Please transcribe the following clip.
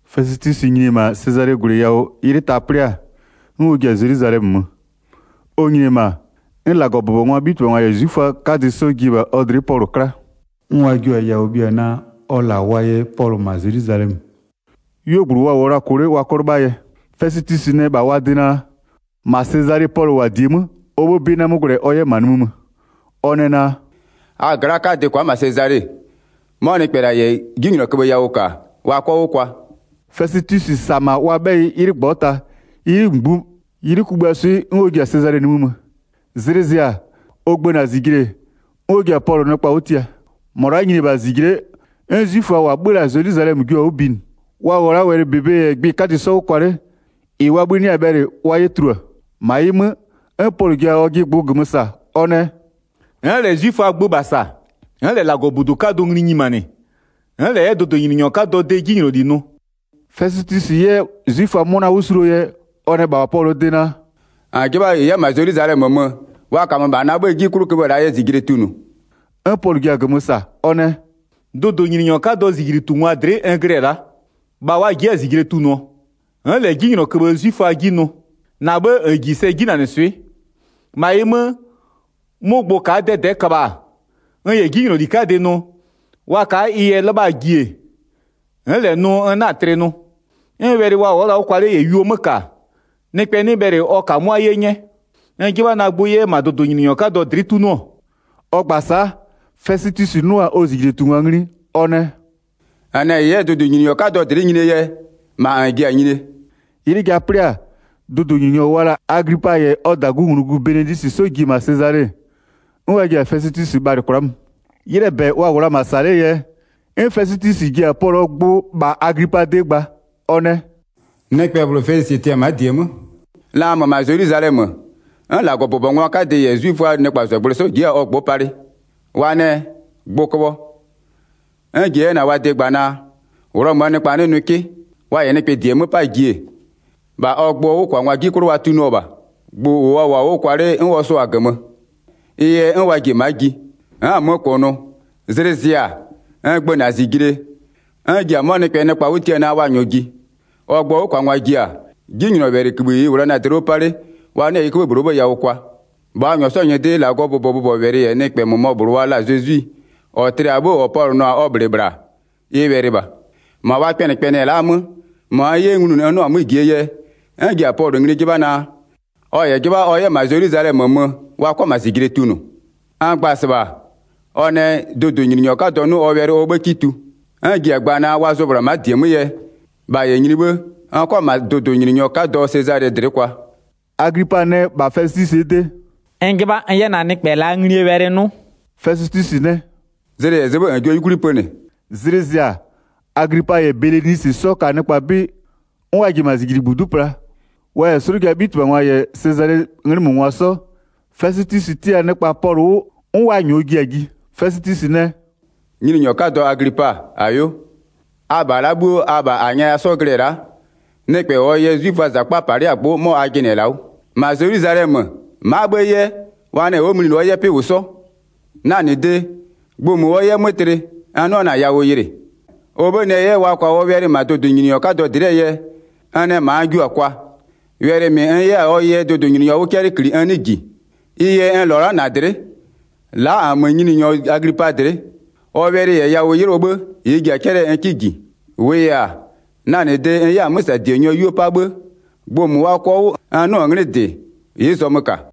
Fɛsɩtwisɩ nyini-e -ma Sezalee -gwlɩ yawʋ 'ylɩ ta 'plɩ-a, 'n ɔ ji-a Zelwizalɛmö mö. Ɔ nyini-e -ma, 'n -Lagɔbʋbɔngwaa 'bhitɩbhangwa -yɛ 'zwiföaa 'kadɩ 'sɔ ji-e -bha ɔ dlɩ'ɩ Pɔlʋ 'kla. 'N wa jio-a yawʋ bhia naa, ɔ -la wa yɛ Pɔlʋ -ma Zelwizalɛmö. 'Yuogblʋ wa -wʋɔ la-a -kʋ 'le wa 'kɔ 'lɩbhaa yɛ. Fɛsɩtwisɩ nɛ -bha wa de naa, -ma Sezale Pɔlʋ -wʋ-a -die 'mö, ɔ 'bhë 'bɩ 'na 'mö gwlɛ ɔ 'yɛ-ɛ -ma nimï mö. Ɔ nɛ naa: “A gla'aa 'kadɩ kwa'a -ma Sezale, 'mɔ nɩkpɛ -la -yɛ 'jinylɔköbhë yawʋ -ka wa 'kɔ 'wʋ kwa.” Fɛsɩtwisɩ -sa-a -ma wa 'bhɛyɩ 'ylɩ -ngbɔta, 'ylɩ kugbïaa swɩ 'n ɔ ji-a Sezale-e nimï mö. Zlɩ zɩ-a ɔ gbëna-a -zijle-e, 'n ɔ ji-a Pɔlʋ nɩkpa 'wʋ tia. 7-Mɔ la'a nyini-e -bha -zijle'e 'n 'zwiföa -wa 'bhö-ö la-a -ma Zelwizalɛmö jio-a 'wʋ binɩ, wa -wʋɔ la'a wɛlɩ -bebe -yɛ gbɩ 'kadɩ 'sɔ 'wʋ kwa 'le, -ɩ wa 'bhï 'nɩ-a bhɛlɩ wa 'yɛ tulua. 8-Ma ɩ 'mö, 'n Pɔlʋ ji-a ɔjɩ gbʋ -gömö -sa, ɔ nɛ: “N'n -lɛ 'zwiföaa gbö -bha -sa, n'n -lɛ -Lagɔbudu 'kadʋ ngli nyimanɩ, n'n -lɛ 'yɛ dʋdʋnyininyɔ 'kadɔɔ de 'jinyloli nʋ.” Fɛsɩtwisɩ 'yɛ 'zwiföa 'mʋna 'wʋ suluo yɛ, ɔ nɛ -bha Pɔlʋɔ de naa: “-N 'jɩbha -n 'yɛ -ma Zelwizalɛmö mö, wa -kamö -bha na 'bhëë 'ji 'klʋ köbhë -laa yɛ -zijle tunʋʋ?” 'N Pɔlʋ ji-a -gömö -sa. Ɔ nɛ: “Dʋdʋnyininyɔ 'kadɔɔ -zijlitungwaa dlɩ'ɩ n glɩ-ɛ la'a, -bha wa ji'i-a -zijle tunʋɔ. N'n -lɛ 'jinylɔköbhë 'zwiföa 'ji nʋ. -Na 'bhë -n -ji sɛ 'jinanɩswɩ'ɩ. 11-Ma ɩ 'mö, 'mʋ gbʋ ka'a 'dɛdɛ'ɛ köbha-a, n -yɛ 'jinyloli 'kadɩ nʋ, wa ka'a ɩ yɛ 'lɩbhaa ji-e, n'n -lɛ nʋ n 'na-a tlɩ nʋ. 'N wɛlɩ wa wʋ'ʋ-ɔ la'a 'wʋ kwa 'le -yɛ yuo 'mö -ka, nɩkpɛ 'nɩ bhɛlɩ ɔ -kamʋ'ʋa 'ye 'nyɛ. N 'jɩbha na gbʋ 'yɛ -ma dʋdʋnyininyɔ 'kadɔ dlɩ'ɩ 'tunʋɔ.” Ɔ gba-a sa'a, Fɛsɩtwisɩ 'nʋ-a ɔ -zijlitungwa ngli, ɔ nɛ: “-N nɛ -n 'yɛ dʋdʋnyininyɔ 'kadɔ dlɩ'ɩ nyinie yɛ, -ma -n ji-a nyinie.” 'Ylɩ ja 'plɩ-a, dʋdʋnyininyɔ wa la-a Aglipa -yɛ ɔ -dagunglugu Belenisɩ 'sɔ ji-e -ma Sezale-e, 'n wa ji-a Fɛsɩtwisɩ bhalɩ kwla'a mö. 'Ylɩɛ -bɛ wa -wʋ la-a -ma -sa 'lee yɛ, 'n Fɛsɩtwisɩ ji-a Pɔlʋɔ gbʋ -bha Aglipaa de gba. Ɔ nɛ: “Nɩkpɛ -bhlʋ Felisɩ tɩ-ɛ ma'a -die 'mö. La n mö-ö -ma Zelwizalɛmö, 'n -Lagɔbʋbɔngwa 'kadɩ -yɛ 'zwiföaa nɩkpazɔgblʋɩ 'sɔ ji'i-a ɔ gbʋ'ʋ palɩ. Wa nɛ: Gbʋ köbhɔ. 'N n ji-e na-a wa de gba naa, Ghlɔmöö nɩkpa 'nɩ nʋɩ 'kɩ. Wa -yɛ nɩkpɛ -die 'mö 'paa ji-e, -bha ɔ gbʋɔ 'wʋkwangwaa 'ji 'klʋ wa tunʋɔ -bha. Gbʋ -ʋ wa -wʋɔ-a 'wʋ kwa 'le 'n ɔ sʋa-a -gömö. Ɩ yɛ 'n wa ji-e ma'a ji. N'n-n 'mö -kʋnʋ, zlɩ zɩ-a, n gbëna-a -zijle, 'n n ji-a 'mɔ nɩkpɛ nɩkpa 'wʋ tia naa wa -nyɔɔ ji. Ɔ gbʋɔ 'wʋkwangwa ji-a, 'jinylɔwɛlɩkïbhï -ɩ n -wʋ la na-a dlɩ 'wʋ 'pa 'le, wa 'nɩɔ-ɔ ɩ 'köbhë -bhlʋɔ 'bhë yawʋ kwa. 19-Bha wa -nyɔɔ 'sɔɔ nyɩdɩ -Lagɔɔ bʋbɔbʋbɔwɛlɩ -yɛ nɩkpɛ -mʋmɔ -bhlʋ wa la-a Zezwi -ɔ tlɩ-a 'bhë -ɔ Pɔlʋ nʋ-a ɔ -bhlɩ -bhla-a, ɩ wɛlɩ -bha. 20-Ma wa kpɛnɩkpɛnɩɛ la'a 'mö, -mɔ n 'yɛ nglunʋ n 'nɩɔ -jie yɛ, 'n n ji-a Pɔlʋ ngli 'jɩbha naa, ɔ -yɛ 'jɩbha ɔ 'yɛ -ma Zelwizalɛmö mö wa 'kɔ -ma -zijle tunʋ. N gba-a -sɩbha ɔ nɛ, dʋdʋnyininyɔ 'kadɔ 'nʋ ɔ wɛlɩ ɔ 'bhë 'kɩ tu. 'N n ji-a gba naa, wa zʋɔ -bhla ma'a -die 'mö yɛ, -bha -yɛ nyini 'bhë n 'kɔ -ma dʋdʋnyininyɔ 'kadɔ Sezalɩ dlɩ'ɩ kwa.” Aglipa nɛ -bha Fɛsɩtwisɩɛ de: “N 'jɩbha n 'yɛ na-a nɩkpɛ -laa nglie wɛlɩ 'nʋ.” Fɛsɩtwisɩ nɛ: “Zlɩ -yɛ zɩ 'bhë -n jio 'yukwli pönɩ.” Zlɩ zɩ-a, Aglipa -yɛ Belenisɩ 'sɔ ka nɩkpa 'bɩ, 'n wa ji-e -ma -zijlitubudu'u pla, wa -yɛ 'slʋjaa 'bhitɩbhangwa -yɛ Sezalee 'nglɩmöngwa 'sɔ. Fɛsɩtwisɩ tia-a nɩkpa Pɔlʋ 'wʋ 'n wa -nyɔɔ ji-a ji. Fɛsɩtwisɩ nɛ: “Nyininyɔ 'kadɔ Aglipa, -ayo. Abha la'a 'bhuo abha -a nyɛya 'sɔ glɩ-ɛ la'a, nɩkpɛ -ɔɔ yɛ 'zwiföaa -zakpa bhë -palɩ'ɩ-a gbʋ'ʋ, 'mɔ a jɩnɩ-ɛ -la 'wʋ. -Ma Zelwizalɛmö, ma'a 'bhë 'yɛ, wa nɛ ɔ'ɔ mlinɩ ɔ 'yɛ 'pɩ -wʋ 'sɔ. Na -nɩ de, gbʋ -mʋ ɔ 'yɛ 'mö tlɩ n 'nɩɔ-ɔ na-a yawʋ yɩlɩ, ɔ 'bhë nɛ 'yɛ wa kwa ɔ wɛlɩ -ma dʋdʋnyininyɔ 'kadɔ dlɩɛ yɛ, n nɛ -ma n jio-a kwa. Wɛlɩ -mɩ n 'yɛ-a ɔ yɛ dʋdʋnyininyɔ 'wʋ 'cɛlɩ -kli n 'nɩɩ -ji, ɩ yɛ n -lɔ-ɔ la'a a dlɩ'ɩ, la'a -nmö nyininyɔ Aglipa dlɩ'ɩ, ɔ wɛlɩ -yɛ yawʋ 'yɩlɩɔ 'bhë -ɩ n ji-a 'cɛlɩɛ n 'kɩ -ji. 27-Wʋʋ yɛ-a, na -nɩ de -n 'yɛ-a 'mö -sa -dienyɔ 'yuo 'pa 'bhë gbʋ -mʋ wa kɔ-a 'wʋ -n 'nʋ-ʋ 'nglɩ -dɩ, ɩ'ɩ zɔmö -ka.”